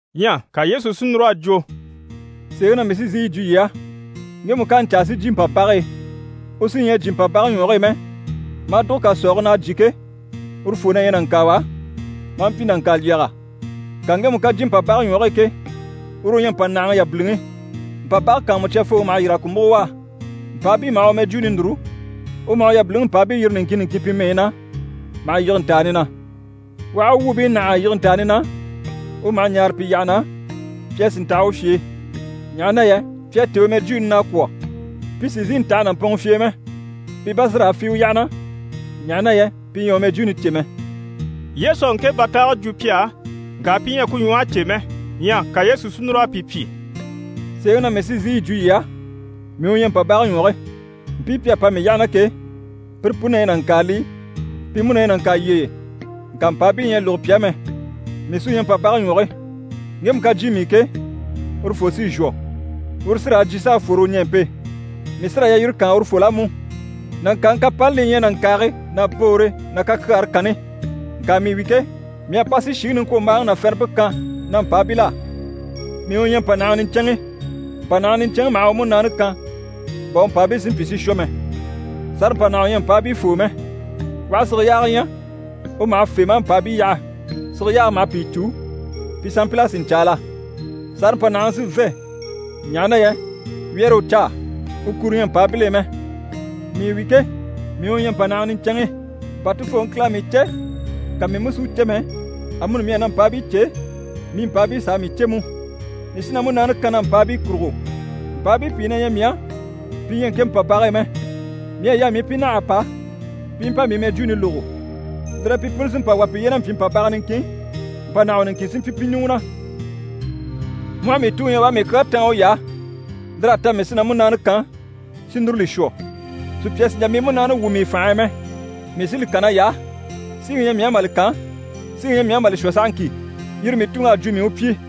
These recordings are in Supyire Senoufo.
Ɲyɛ ka Yesu si núr'a jwo: «Sèeŋi na mii sí n‑sìi yi jwo yii á, ŋgemu ká a ɲcaa si jyè mpàbage e, u sí ɲyɛ a jyè mpàbage ɲwɔge e mɛ, maa dùgo kàsɔɔge na a jyè ke, urufoo na ɲyɛ nàŋkaawa, maa mpyi nàŋkalyɛga. Ŋka ŋgemu ká jyè mpàbage ɲwɔge e ke, uru u ɲyɛ mpànahaŋi yabiliŋi. Mpàbage kàanmucyafooŋi maha yîr'a ku múgo u á. Mpàabii maha u mɛjwuuni núru, u maha u yabiliŋi mpàabii yiri niŋkin niŋkin pi mɛyi na, maha yige ntàani na. U aha u wuubii nâha a yige ntàani na, u maha ɲaare pi yyaha na pi a sì ntaha u fye e, ɲaha na yɛ pi à têe u mɛjwuuni na a kwɔ̀. Pi sì n‑sìi n‑taha nàmpɔnŋɔ fye e mɛ, pi bá sí raa fî u yyaha na, ɲaha na yɛ pi ɲyɛ a u mɛjwuuni cè mɛ.» Yesu à ŋke bàtaage jwo pi á, ŋka pi ɲyɛ a ku ɲwɔhe cè mɛ. Ɲyɛ ka Yesu si núr'a pi pyi: «Sèeŋi na mii sí n‑sìi yi jwo yii á, mii u ɲyɛ mpàbage ɲwɔge. Mpii pi à pa mii yyaha na ke, pire puni na ɲyɛ nàŋkaalii, pi mú na ɲyɛ nàŋkalyɛye, ŋka mpàabii ɲyɛ a lógo pi á mɛ. Mii sí u ɲyɛ mpàbage ɲwɔge. Ŋgemu ká jyè mii i ke, urufoo sí n‑shwɔ. Uru sí raa jyè, s'a fwore u ɲɛɛmpe. Mii sí raa yalyire kaan urufol'á mú. Nàŋkaaŋi kapani li ɲyɛ nàŋkaage ná boore ná kakyaare kanni. Ŋka mii wi ke, mii à pa si shìŋi niŋkwombaaŋi ná fɛrɛmpe kan na mpàabil'á. Mii u ɲyɛ mpànahaŋi niɲcɛnŋi. Mpànahaŋi niɲcɛnŋi maha u múnaani kan bà u mpàabii si mpyi si shwɔ mɛ. Sàrampanahawa ɲyɛ mpàabii foo mɛ. U aha sige yaaga ɲya, u maha fê maa mpàabii yaha. Sige yaage maha pìi cû, pi sanmpil'a sì ɲcaala. Sàrampanahaŋi sí n‑fê, ɲaha na yɛ wyɛ́rɛ u caa, u kuro ɲyɛ mpàabil'e mɛ. Mii wi ke, mii u ɲyɛ mpànahaŋi niɲcɛnŋi. Bà Tufooŋi Kile à mii cè, ka mii mú si u cè mɛ, amuni mii à na mpàabii cè, mii mpàabii s'à mii cè mú. Mii sí na múnaani kan na mpàabii kurugo. Mpàabii pìi na ɲyɛ mii á, pi ɲyɛ ŋke mpàbage e mɛ. Mii à yaa mii i pi nâha a pa, pi i mpa mii mɛjwuuni lógo. Lire e pi puni sí n‑pa wà piye na mpyi mpàbaga niŋkin, mpànahawa niŋkin sí n‑pyi pi ɲùŋɔ na. Mu aha mii Tuŋi ɲya u à mii kyaa táan uy'á, lir'à ta mii sí na múnaani kan, si núru li shwɔ. Sùpya sì n‑jà mii múnaani wwû mii i fànhe e mɛ. Mii sí li kan nay'á. Síŋi ɲyɛ mii á mà li kan, síŋi ɲyɛ mii á mà li shwɔ sahaŋki. Yire mii Tuŋi à jwo mii u pyi.»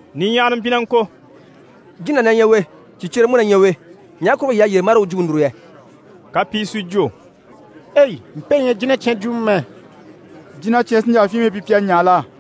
Niɲyahara mpyi na ŋko: «Jína na ɲyɛ u e, sìcyere mú na ɲyɛ u e. Ɲaha kurugo yii à yyére marii u jwumpe núru yɛ?» Ka pìi si jwo: «Ei! mpe ɲyɛ jínacyan jwumɔ mɛ. Jínacyan sí n‑jà fyinmii pyi pi a ɲaa la?»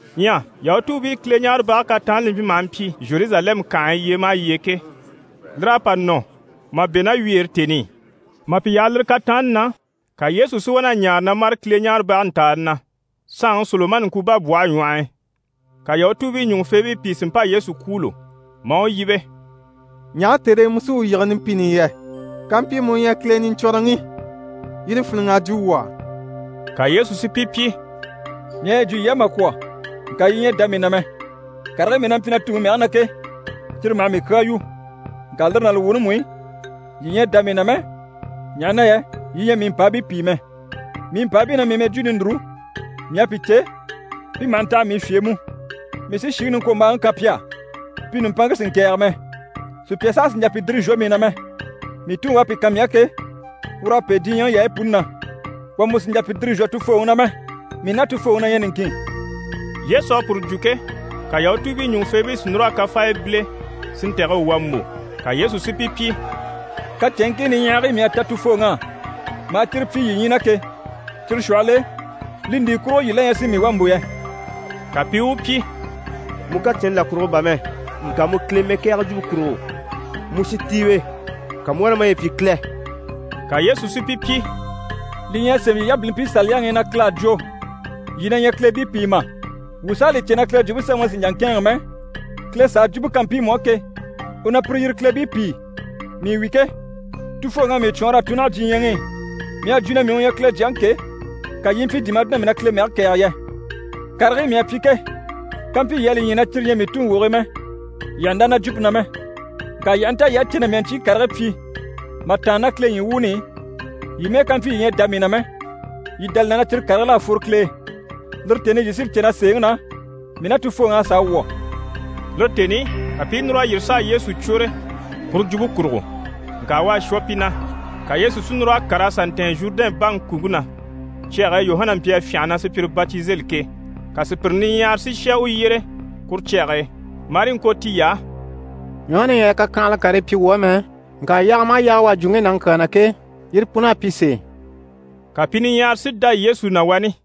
Ɲyɛ YahutuubiiKileɲaarebage kataanni li maha mpyi Zheruzalɛmu kànhe e yyee maha yyee ke, lir'à pa nɔ mà bɛ̂ ná wyeere tèni i. Mà pi yaha lire kataanni na, ka Yesu si wá na ɲaare na mâre Kileɲaarebage ntàani na, saanŋi Solomani ŋkubabwɔhe ɲwɔh'i. Ka Yahutuubii ɲùŋufeebii pìi si mpa Yesu kwûulo maa u yíbe: «Ɲaha tère e mu sí wuu yige numpini i yɛ? Kampyi mu u ɲyɛ Kile Niɲcwɔnrɔŋi, yire fíniŋ'a jwo wuu á.» Ka Yesu si pi pyi: «Mii à yi jwo yii á mà kwɔ̀, ŋka yii ɲyɛ a dá mii na mɛ. Karigii mii na mpyi na Tuŋi mɛge na ke, cyire maha mii kyaa yu. Ŋka lire ná li wuuni mú i, yii ɲyɛ a dá mii na mɛ, ɲaha na yɛ yii ɲyɛ mii mpàabii pìi mɛ. Mii mpàabii na mii mɛjwuuni núru, mii à pi cè, pi maha ntaha mii fye e mú. Mii sí shìŋi niŋkwombaaŋi kan pi á, pi nùmpanŋke sì n‑kɛ̀ɛge mɛ. Sùpya saha sì n‑jà pi dìri n‑shwɔ mii na mɛ. Mii Tuŋi u à pi kan mii á ke, ur'à pêe diɲyɛŋi yaayi puni na. Wà mú sì n‑jà pi dìri n‑shwɔ Tufooŋi na mɛ. Mii ná Tufooŋi na ɲyɛ niŋkin.» Yesu à puru jwo ke, ka Yahutuubii ɲùŋufeebii si núr'a kafaaya bíle si ntɛ̀gɛ u wà mbò. Ka Yesu si pi pyi: «Kacɛnŋkii niɲyahagii mii à ta Tufooŋi á, maa cyire pyi yii ɲyii na ke, cyire shwɔhɔl'e li ndi kurugo yii la ɲyɛ si mii wà mbò yɛ?» Ka pi i u pyi: «Mu kacɛnni là kurugo bà mɛ, ŋka mu Kile mɛkɛɛgɛ jwumpe kurugo. Mu shintiiwe, ka mu u wá na maye pyi Kile.» Ka Yesu si pi pyi: «Li ɲyɛ a sémɛ yii yabilimpii Saliyaŋi i na Kile à jwo “Yii na ɲyɛ kileebii pìi” mà? Wuu s'à li cè na Kile Jwumpe Semɛŋi sì n‑jà n‑kɛ̂ɛnŋɛ mɛ, Kile s'à jwumpe kan mpiimu á ke, u na pire yire “kileebii” pìi. Mii wi ke, Tufooŋi à mii cwɔɔnr'a tun naha diɲyɛŋi i. Mii à jwo na mii u ɲyɛ Kile Jyaŋi ke, ka yii i mpyi di mà jwo na mii na Kile mɛge kɛ̀ɛge yɛ? Karigii mii à pyi ke, kampyi yii à li ɲya na cyire ɲyɛ mii Tuŋi wogigii mɛ, yii àha ndá na jwumpe na mɛ. Ŋka yii aha nta yii à cè na mii à ɲcyii karigii pyi mà tàanna ná Kile ɲyii wuuni i, yii mɛ́ɛ ká mpyi yii ɲyɛ a dá mii na mɛ, yii dá li na na cyire karigil'à fworo Kile e. Lire tèni i yii sí li cè na sèeŋi na, mii ná Tufooŋi à sàa wwɔ̀.» Lire tèni i, ka pi i núr'a yîri s'a Yesu cwôre puru jwumpe kurugo, ŋka u à shwɔ pi na. Ka Yesu si núr'a kàr'a sà ntɛ̀ɛn Zhurudɛn baŋi kùŋke na, cyage e Yuhana mpyi a fyânha na sùpyire batizeli ke. Ka sùpyire niɲyahara si shà u yyére kuru cyage e. Marii ŋko tiy'á: «Yuhana ɲyɛ a kakyanhala karii pyi wuu á mɛ, ŋka yaaga maha yaaga u à jwo ŋge nàŋi kyaa na ke, yire pun'à pyi sèe.» Ka pi niɲyahara si dá Yesu na wani.